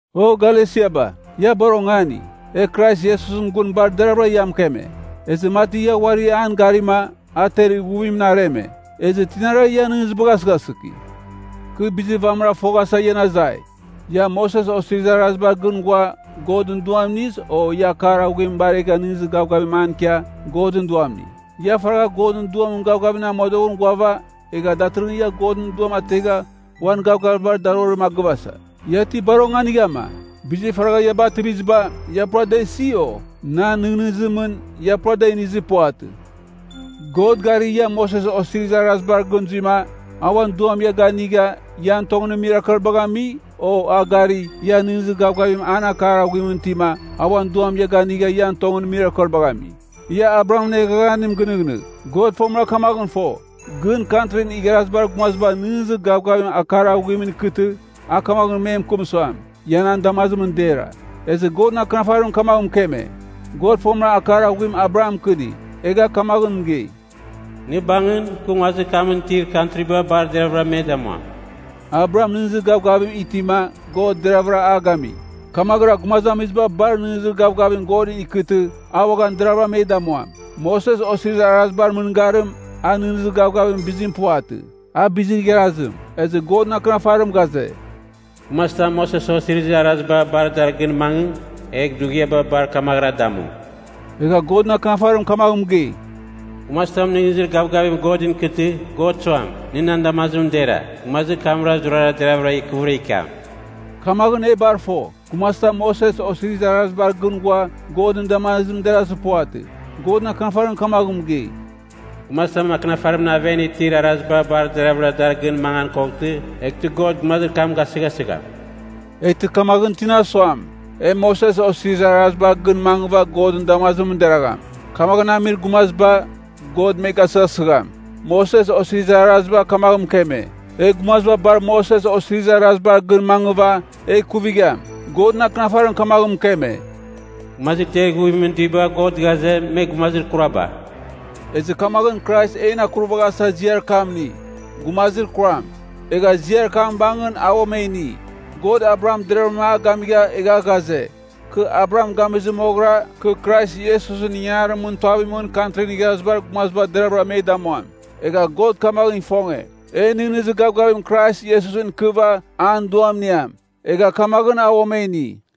O Galesiaba, ia bar ongani. E Krais Iesusɨn gun bar deravɨra ia mɨkeme. Ezɨ mati ia uari an garima, a ter ighuvimɨn areme. Ezɨ tinara ian nɨghnɨzibagh asɨghasɨki. Kɨ bizir vamɨra foghasa ian azai. Ia, Moses Osirizir Arazibar gɨn ghua, Godɨn Duam iniz, o ia akar aghuim baregha nɨghnɨzir gavgavim an ikia, Godɨn Duam ini? Ia faragha Godɨn Duamɨn gavgavimɨn amodoghɨn ghuava, egha datɨrɨghɨn ia Godɨn Duam ategha uan gavgavibar darorim a gɨvasa. Ia ti bar onganighama? Bizir faragha ia bativiziba, ia pura a da isi, o? Nan nɨghnɨzimɨn, ia pura da inizir puvatɨ. God gari, ia Moses Osirizir Araziba gɨn zuima, a uan Duam ia ganigha, ian tongɨn mirakelbagh ami? O a gari, ia nɨghnɨzir gavgavim an akar aghuimɨn itima, a uan Duam ia ganigha ian tongɨn mirakelbagh ami? Ia Abrahamɨn eghaghanim gɨnɨghnɨgh. God fomɨra kamaghɨn fo, gɨn Kantrin Igharazibar Gumaziba nɨghnɨzir gavgavim akar aghuimɨn ikɨtɨ, a kamaghɨn me mɨkɨm suam, ia nan damazimɨn dera. Ezɨ Godɨn Akɨnafarim kamaghɨn mɨkeme, God fomɨra akar aghuim Abraham mɨkɨni, egha kamaghɨn mɨgei, “Nɨ bangɨn, kɨ nguazir kamɨn itir kantriba bar deravɨra me damuam.” Abraham nɨghnɨzir gavgavim itima, God deravɨra a gami. Kamaghɨra gumazamiziba bar nɨghnɨzir gavgavim Godɨn ikɨtɨ, a uaghan deravɨra me damuam. Moses Osirizir Arazibar mɨngarim, a nɨghnɨzir gavgavimɨn bizim puvatɨ, a bizir igharazim. Ezɨ Godɨn Akɨnafarim ghaze, “Gumazitam Moses Osirizir Araziba bar dar gɨn mangɨ, egh dughiaba bar kamaghɨra damu.” Egha Godɨn Akɨnafarim kamaghɨn mɨgei, “Gumazitam nɨghnɨzir gavgavim Godɨn ikɨtɨ, God suam, nɨ nan damazimɨn dera, gumazir kamra zurara deravɨra ikɨvɨra ikiam.” Kamaghɨn, e bar fo, gumazitam Moses Osirizir Arazibar gɨn ghua, Godɨn damazimɨn derazir puvatɨ. Godɨn Akɨnafarim kamaghɨn mɨgei, “Gumazitam akɨnafarimɨn aven itir araziba bar deravɨra dar gɨn mangan koghtɨ, eghtɨ God gumazir kam gasɨghasigham.” Eghtɨ kamaghɨn tina suam, e Moses Osirizir Arazibar gɨn mangɨva Godɨn damazimɨn deragham, kamaghɨn amir gumaziba, God me gasɨghasɨgham. Moses Osirizir Araziba kamagh mɨkeme, e gumaziba bar Moses Osirizir Arazibar gɨn mangɨva, egh ikuvigham. Godɨn Akɨnafarim kamaghɨn mɨkeme, “Gumazir ter ighuvimɨn duiba God ghaze, me gumazir kuraba.” Ezɨ kamaghɨn Krais en akuravaghasa ziar kam ini, “gumazir kuram.” Egha ziar kam bangɨn a uam e ini. God Abraham deravɨra a gamigha egha ghaze, kɨ Abraham gamizɨ moghɨra, kɨ Krais Iesusɨn ingangarimɨn tuavimɨn Kantrin Igharazibar Gumaziba deravɨra me damuam. Egha God kamaghɨn ifonge, e nɨghnɨzir gavgavim Krais Iesusɨn ikɨva, an Duam iniam. Egha kamaghɨn a uam e ini.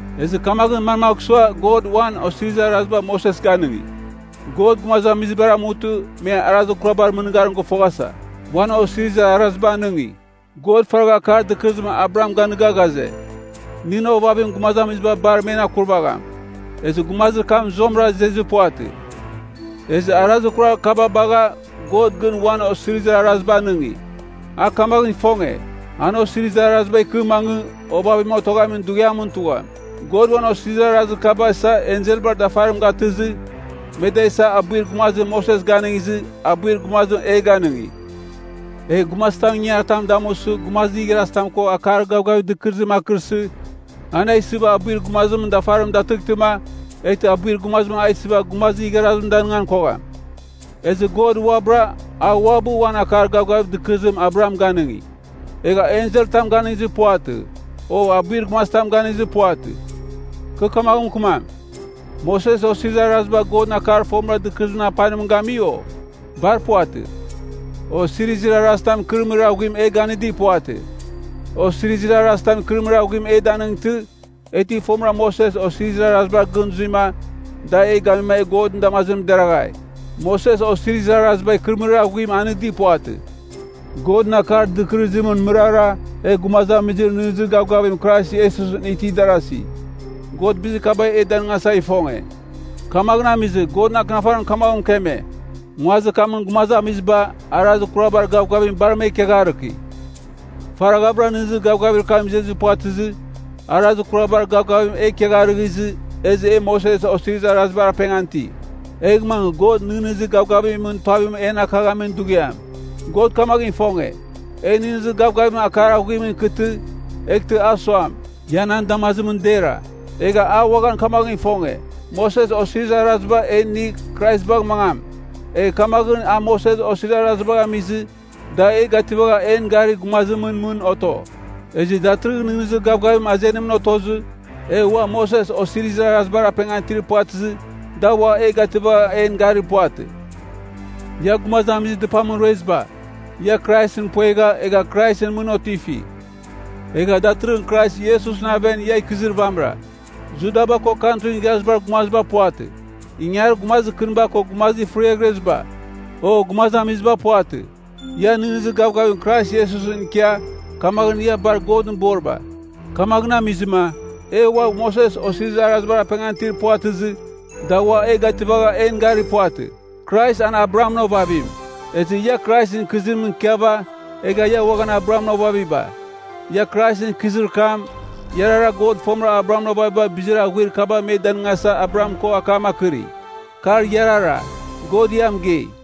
Ezɨ kamaghɨn manmagh sua God uan osirizir araziba Moses ganɨngi? God gumazamizibar amutɨ, me arazir kurabar mɨngarim gɨfoghasa, uan osirizir araziba anɨngi. God faragha akar dɨkɨrɨzim Abraham ganigha ghaze, nɨn ovavim gumazamiziba bar men akurvagham. Ezɨ gumazir kam zuamɨra izezir puvatɨ. Ezɨ arazir kurar kaba bagha, God gɨn uan osirizir araziba anɨngi. A kamaghɨn ifonge, an osirizir araziba ikɨ mangɨ, ovavim otoghamin dughiamɨn tugham. God uan osirizir arazir kaba isa enselbar dafarim gatɨzɨ, me da isa abuir gumazim Moses ganɨngizɨ, abuir gumazim e ganɨngi. Egh gumazitam ingangaritam damusɨ gumazir igharazitam ko akar gavgavir dɨkɨrɨzim akɨrsɨ, an a isɨva abuir gumazimɨn dafarim datɨghtɨma, eghtɨ abuir gumazim a isɨva gumazir igharazim danɨngan kogham. Ezɨ God uabɨra, a uabɨ uan akar gavgavir dɨkɨrɨzim Abraham ganɨngi, egha enselɨn tam ganɨngizir puvatɨ, o abuir gumazitam ganɨngizir puvatɨ. Kɨ kamaghɨn mɨkɨmam, Moses Osirizir Araziba Godɨn akar fomɨra dɨkɨrɨzimɨn apanim gami, o? Bar puvatɨ. Osirizir arazitam ikɨrɨmɨrir aghuim e ganɨdir puvatɨ. Osirizir arazitam ikɨrɨmɨrir aghuim e danightɨ, e ti fomɨra Moses Osirizir Arazibar gɨn zuima, da e gamima e Godɨn damazimɨn deraghai. Moses Osirizir Araziba ikɨrɨmɨrir aghuim anɨdi puvatɨ. Godɨn akar dɨkɨrɨzimɨn mɨrara e gumazamizir nɨghnɨzir gavgavim Krais Iesusɨn itir darazi. God bizir kaba e danɨngasa ifonge. Kamaghɨn amizɨ, Godɨn Akɨnafarim kamaghɨn mɨkeme, nguazir kamɨn gumazamiziba, arazir kurabar gavgavim bar me ikiagharɨki. Faraghavɨra nɨghnɨzir gavgavir kam izezɨ puvatɨzɨ, arazir kurabar gavgavim e ikiagharɨghɨzɨ, ezɨ e Moses Osirizir Arazibar apengan iti. Egh mangɨ God nɨghnɨzir gavgavimɨn tuavim en akaghamin dughiam. God kamaghɨn ifonge, e nɨghnɨzir gavgavim akar aghuimɨn ikɨtɨ, eghtɨ a suam, ia nan damazimɨn dera. Egha, a uaghan kamaghɨn ifonge, Moses Osirizir Araziba e inigh Krais bagh mangam. Egha kamaghɨn a Moses Osirizir Arazibagh amizɨ, da e gativagha en garir gumazimɨn mɨn oto. Ezɨ datɨrɨghɨn nɨghnɨzir gavgavim azenimɨn otozɨ, e ua Moses Osirizir Arazibar apengan itir puvatɨzɨ da ua e gativagha en gari puvatɨ. Ia gumazamizir dɨpamɨn rueziba, ia Kraisɨn puegha, egha Kraisɨn mɨn otifi. Egha datɨrɨghɨn Krais Iesusɨn aven ia ikɨzir vamɨra. Judaba ko Kantrin Igharazibar Gumaziba puvatɨ, ingangarir gumazir kɨniba ko gumazir fɨriaghreziba, o gumazamiziba puvatɨ. Ia nɨghnɨzir gavgavim Krais Iesusɨn ikia, kamaghɨn ia bar Godɨn boriba. Kamaghɨn amizɨma, e ua Moses Osirizir Arazibar apengan itir puvatɨzɨ, da ua e gativagha en garir puvatɨ. Krais an Abrahamɨn ovavim. Ezɨ ia Kraisɨn ikɨzimɨn ikɨva, egh ia uaghan Abrahamɨn ovaviba. Ia Kraisɨn ikɨzir kam, iarara God fomɨra Abrahamɨn ovaviba bizir aghuir kaba me danɨngasa Abraham ko akam akɨri. Kar iarara, God ia mɨgei.